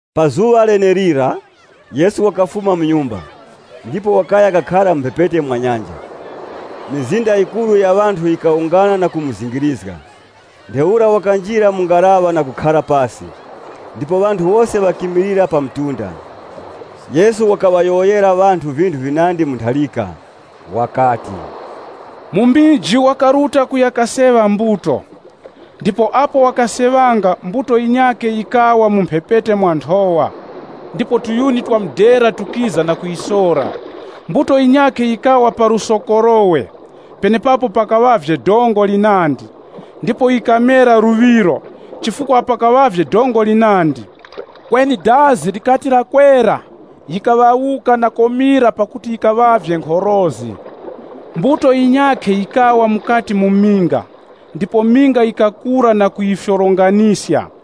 Pa zuŵa lenelira Yesu wakafuma mu nyumba, ndipo wakaya kakhara mu mphepete mwa nyanja. Mizinda yikuru ya ŵanthu yikawungana na kumuzingirizga. Ntheura wakanjira mu ngaraŵa na kukhara pasi, ndipo ŵanthu wose ŵakimilira pa mtunda. Yesu wakaŵayowoyera ŵanthu vinthu vinandi mu ntharika. Wakati, “Mumiji wakaruta kuya kaseŵa mbuto. Ndipo apo wakaseŵanga, mbuto yinyakhe yikawa mu mphepete mwa nthowa, ndipo tuyuni tukiza tukayisora. Mbuto yinyakhe yikawa pa lusokorowe, penepapo pakaŵavye dongo linandi. Ndipo yikamera luŵiro chifukwa pakaŵavye dongo linandi. Kweni dazi likati lakwera, yikaŵawuka na komira pakuti yikaŵavye nkhorozi. Mbuto yinyakhe yikawa mukati mu minga, ndipo minga yikakura na kuyifyoronganiska.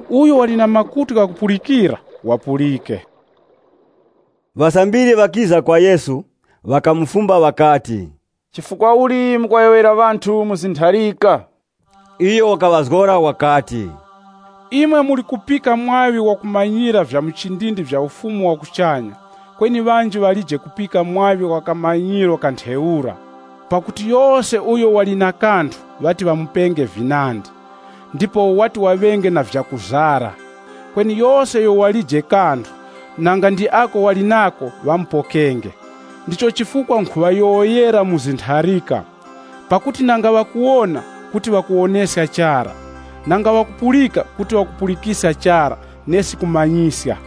Uyo wali na makutu ghakupulikira, wapulike.” Ŵasambiri ŵakiza kwa Yesu, ŵakamufumba ŵakati, “Chifukwa uli mukuŵayowoyera ŵanthu mu zintharika?” Iyo wakaŵazgora wakati, “Imwe muli kupika mwaŵi wakumanyira vya muchindindi vya Ufumu wa kuchanya, kweni ŵanji ŵalije kupika mwaŵi wa kamanyiro ka ntheura. Pakuti yose uyo wali na kanthu ŵati ŵamupenge vinandi, ndipo wati waŵenge na vyakuzara. Kweni yose uyo walije kanthu, nanga ndi ako wali nako ŵamupokenge. Ndicho chifukwa nkhuŵayowoyera mu zintharika. Pakuti nanga ŵakuwona, kuti ŵakuwoneska chara, nanga ŵakupulika kuti ŵakupulikiska chara nesi kumanyiska.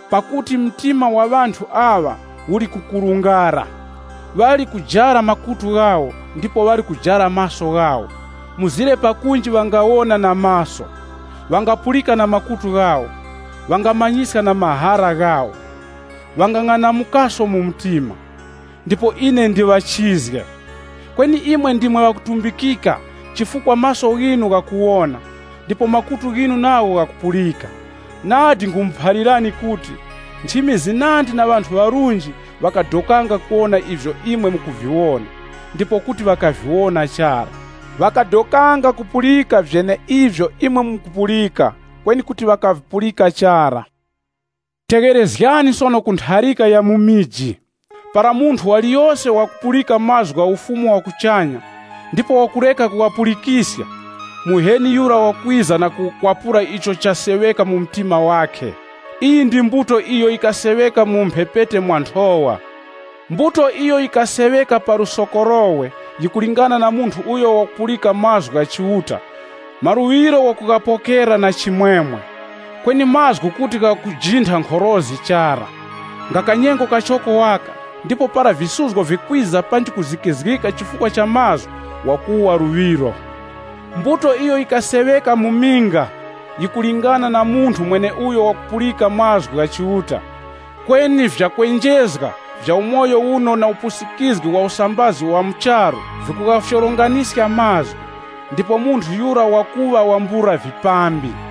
Pakuti mtima wa ŵanthu aŵa uli kukurungara, ndipo makutu ghawo ngazitu kupulika, ndiposo ŵali kujara maso ghawo, mzire ŵawone na maso ghawo, na kupulika na makutu ghawo, ndipo ŵamanyiske na mahara ghawo, ndipo ŵawerere kwa ine kuti ine ndiŵachizge.’ “Kweni imwe ndimwe ŵakutumbikika chifukwa maso ghinu ghakuwona, ndipo makutu ghinu nagho ghakupulika. Nadi nkhumuphalirani kuti, nchimi zinandi na ŵanthu ŵarunji ŵakadokanga kuwona ivyo imwe mukuviwona, ndipo kuti ŵakaviwona chara. Ŵakadokanga kupulika vyeneivyo imwe mukupulika, kweni kuti ŵakavipulika chara.” “Tegherezgani sono ku ntharika ya mumiji. Para munthu waliyose wakupulika mazgu gha Ufumu wa kuchanya, ndipo wakureka kughapulikiska, Muheni Yura wakwiza na kukwapura icho chaseŵeka mu mtima wakhe. Iyi ndi mbuto iyo yikaseŵeka mu mphepete mwa nthowa. Mbuto iyo yikaseŵeka pa lusokorowe, yikulingana na munthu uyo wakupulika mazgu gha Chiuta, maluŵiro wakughapokera na chimwemwe. Kweni mazgu kuti ghakujintha nkhorozi chara. Nga kanyengo kachoko waka, ndipo para visuzgo vikwiza panji kuzikizgika chifukwa cha mazgu, wakuwa luŵiro. Mbuto iyo yikaseŵeka mu minga, yikulingana na munthu mweneuyo wakupulika mazgu gha Chiuta. Kweni vyakwenjezga vya umoyo na upusikizgi wa usambazi wa mu charu, vikughafyoronganiska mazgu ndipo munthu yura wakuŵa wambula vipambi.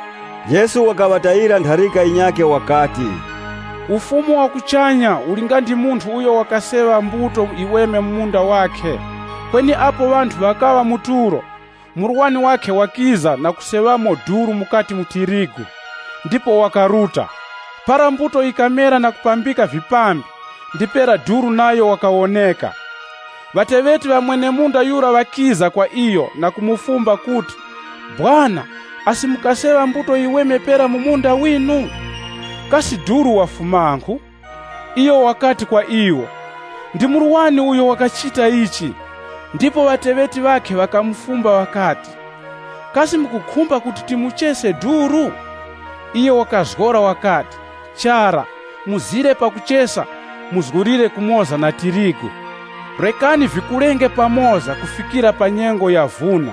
Yesu wakaŵatayira ntharika yinyakhe wakati, “Ufumu wa kuchanya uli nga ndi munthu uyo wakaseŵa mbuto yiweme mu munda wakhe. Kweni apo ŵanthu ŵakaŵa mu tulo, murwani wakhe wakiza na kuseŵamo duru mukati mu tirigu, ndipo wakaruta. Para mbuto yikamera na kupambika vipambi, ndipera duru nayo wakawoneka. Ŵateŵeti ŵa mwene-munda yura ŵakiza kwa iyo na kumufumba kuti, ‘Sekuru, asi mukaseŵa mbuto yiweme pera mu munda winu? Kasi duru wafumankhu?’ Iyo wakati kwa iwo, ‘Ndi murwani uyo wachita ichi.’ Ndipo ŵateŵeti ŵakhe ŵakamufumba ŵakati, ‘Kasi mukukhumba kuti timuchese duru?’ Iyo wakazgora wakati, ‘Chara, mzire pakuchesa muzgulire kumoza na tirigu. Rekani vikulenge pamoza kufikira pa nyengo ya vuna.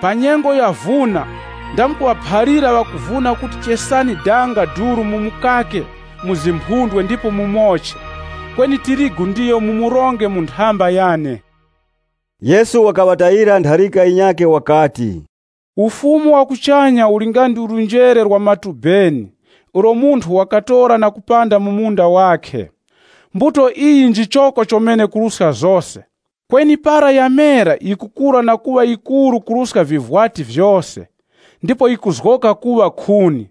Pa nyengo ya vuna ndamkuŵaphalira ŵakuvuna kuti ŵachese danga duru na kumukaka mu zimphundwe ndipo ŵamoche, kweni tirigu ndiyo ŵamuronge mu nthamba yane.’” Yesu wakaŵatayira ntharika yinyakhe wakati, “Ufumu wa kuchanya uli nga ndi njere la matubeni ulo munthu wakatora na kupanda mu munda wakhe. Mbuto iyi njichoko chomene kuruska zose. Kweni para yamera yikukura na kuŵa yikuru kuruska vivwati vyose, ndipo yikuzgoka kuŵa khuni.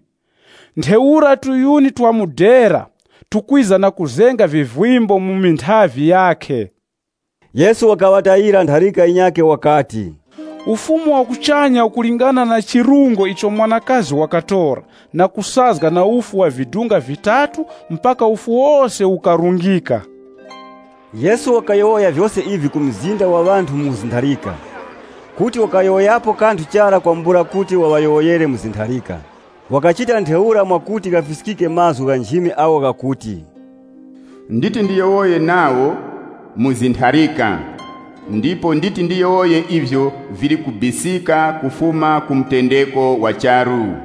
Ntheura viyuni vya mudera vikwiza na kuzenga vivimbo mu minthavi yakhe.” Yesu wakaŵatayira ntharika yinyakhe wakati, “Ufumu wa kuchanya ukulingana na chirungo icho mwanakazi wakatora na kusazga na ufu wa vidunga vitatu mpaka ufu wose ukarungika.” Yesu wakayowoya vyose ivi ku mzinda wa ŵanthu mu zintharika. Kuti wakayowoyapo kanthu chara kwambula kuti wayowoyere mu zintharika. Wakachita ntheura mwakuti ghafiskike mazgu gha nchimi agho ghakuti, “Nditi ndiyowoye nawo mu zintharika. Nditi ndiyowoye ivyo vili kubisika kufuma ku mutendeko wa charu.”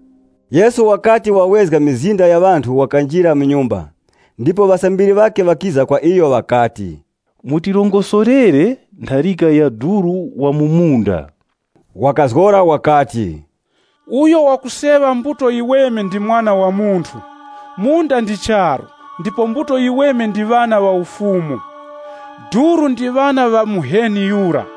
Yesu wakati wawezga mizinda ya ŵanthu wakanjira mu nyumba. Ndipo ŵasambiri ŵakhe ŵakiza kwa iyo ŵakati, “Mutirongosorere ntharika ya duru wa mu munda.” Wakazgora wakati, “Uyo wakuseŵa mbuto yiweme ndi Mwana wa Munthu. Munda ndi charu, ndipo mbuto yiweme ndi ŵana ŵa Ufumu. Duru ndi ŵana ŵa Muheni Yura.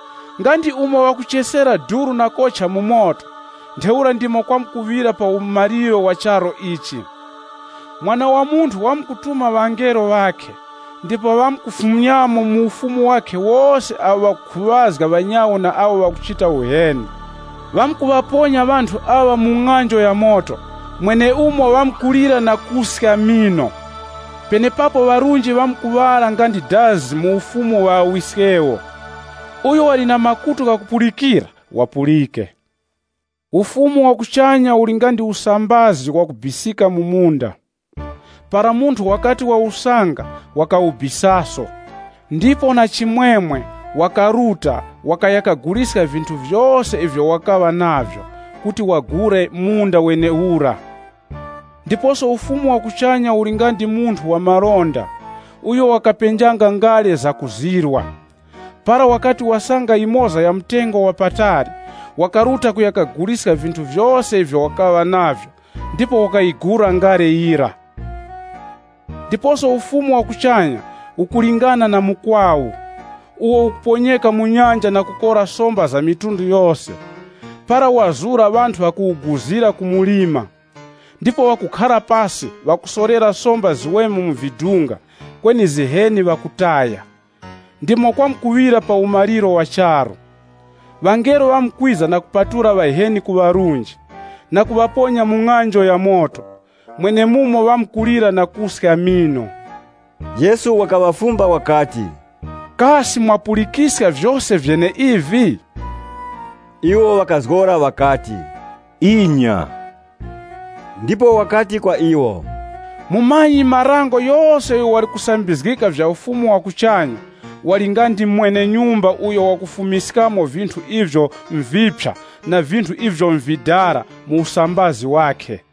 Nga ndi umo ŵakuchesera duru na kocha mu moto, ntheura ndimo kwamkuŵira pa umaliro wa charu ichi. Mwana wa Munthu wamkutuma ŵangelo ŵakhe ndipo ŵamkufumyamo mu Ufumu wakhe wose awo ŵakukhuŵazga ŵanyawo na awo ŵakuchita uheni. Ŵamkuŵaponya ŵanthu aŵa mu ng'anjo ya moto, mwenemumo ŵamkulira na kuska mino. Penepapo ŵarunji ŵamkuŵala nga ndi dazi mu Ufumu wa Ŵawiskewo. Uyo wali na makutu ghakupulikira, wapulike.” “Ufumu wa kuchanya uli nga ndi chuma chakubisika mu munda. Para munthu wachisanga, wakuchibisaso. Ndipo na chimwemwe wakuruta na kuguliska vinthu vyose ivyo wali navyo na kuya kagula munda wenewura.” “Ndiposo Ufumu wa kuchanya uli nga ndi munthu wa malonda, uyo wakapenjanga ngale zakuzirwa. Para wakati wasanga yimoza ya mtengo wa patali, wakaruta kuya kaguliska vinthu vyose ivyo wakaŵa navyo, ndipo wakayigula ngale yira.” “Ndiposo Ufumu wa kuchanya ukulingana na mukwawu, uwo ukuponyeka mu nyanja na kukora somba za mitundu yose. Para wazura, ŵanthu ŵakuwuguzira pa mlima. Ndipo ŵakukhara pasi ndipo ŵakusolera somba ziweme mu vidunga, kweni ziheni ŵakutaya. Ndimo kwamkuŵira pa umaliro wa charu. Ŵangelo ŵamkwiza na kupatula ŵaheni ku ŵarunji, na kuŵaponya mu ng'anjo ya moto, mwenemumo ŵamkulira na kuska mino.” Yesu wakaŵafumba wakati, “Kasi mwapulikiska vyose vyeneivi?” Iwo ŵakazgora ŵakati, “Inya.” Ndipo wakati kwa iwo, “Mumanyi-marango yose uyo wali kusambizgika vya Ufumu wa kuchanya, wali nga ndi mwene-nyumba uyo wakufumiskamo vinthu ivyo nviphya na vinthu ivyo nvidala mu usambazi wakhe.”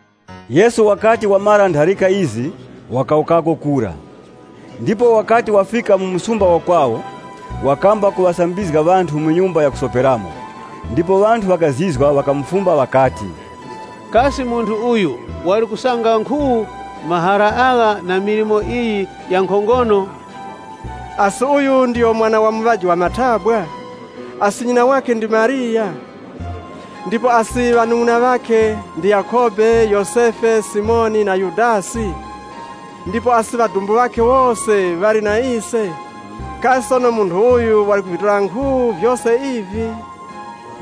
Yesu wakati wamara ntharika izi, wakawukako kura. Ndipo wakati wafika mu msumba wa kwawo, wakamba kuŵasambizga ŵanthu mu nyumba ya kusoperamo. Ndipo ŵanthu ŵakazizwa, ŵakafumba ŵakati, “Kasi munthu uyu wali kusanga nkhu mahara agha na milimo iyi ya nkhongono? Asi uyu ndiyo mwana wa muŵaji wa mathabwa? Asi nyina ndi Mariya? Ndipo asi ŵanung'una ŵakhe ndi Yakhobe, Yosefe, Simoni, na Yudasi? Ndipo asi ŵadumbu ŵakhe wose ŵali na ise? Kasi sono munthu uyu wali kuvitora nkhu vyose ivi?”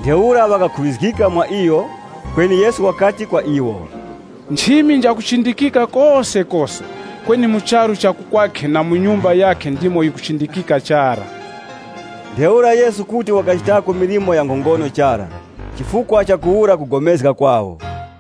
Ntheura ŵakakhuŵazgika mwa iyo. Kweni Yesu wakati kwa iwo, “Nchimi njakuchindikika kosekose, kweni mu charu cha ku kwakhe na mu nyumba yakhe ndimo yikuchindikika chara.” Ntheura Yesu kuti wakachitako milimo ya nkhongono chara, chifukwa chakuwura kupulikana kwawo.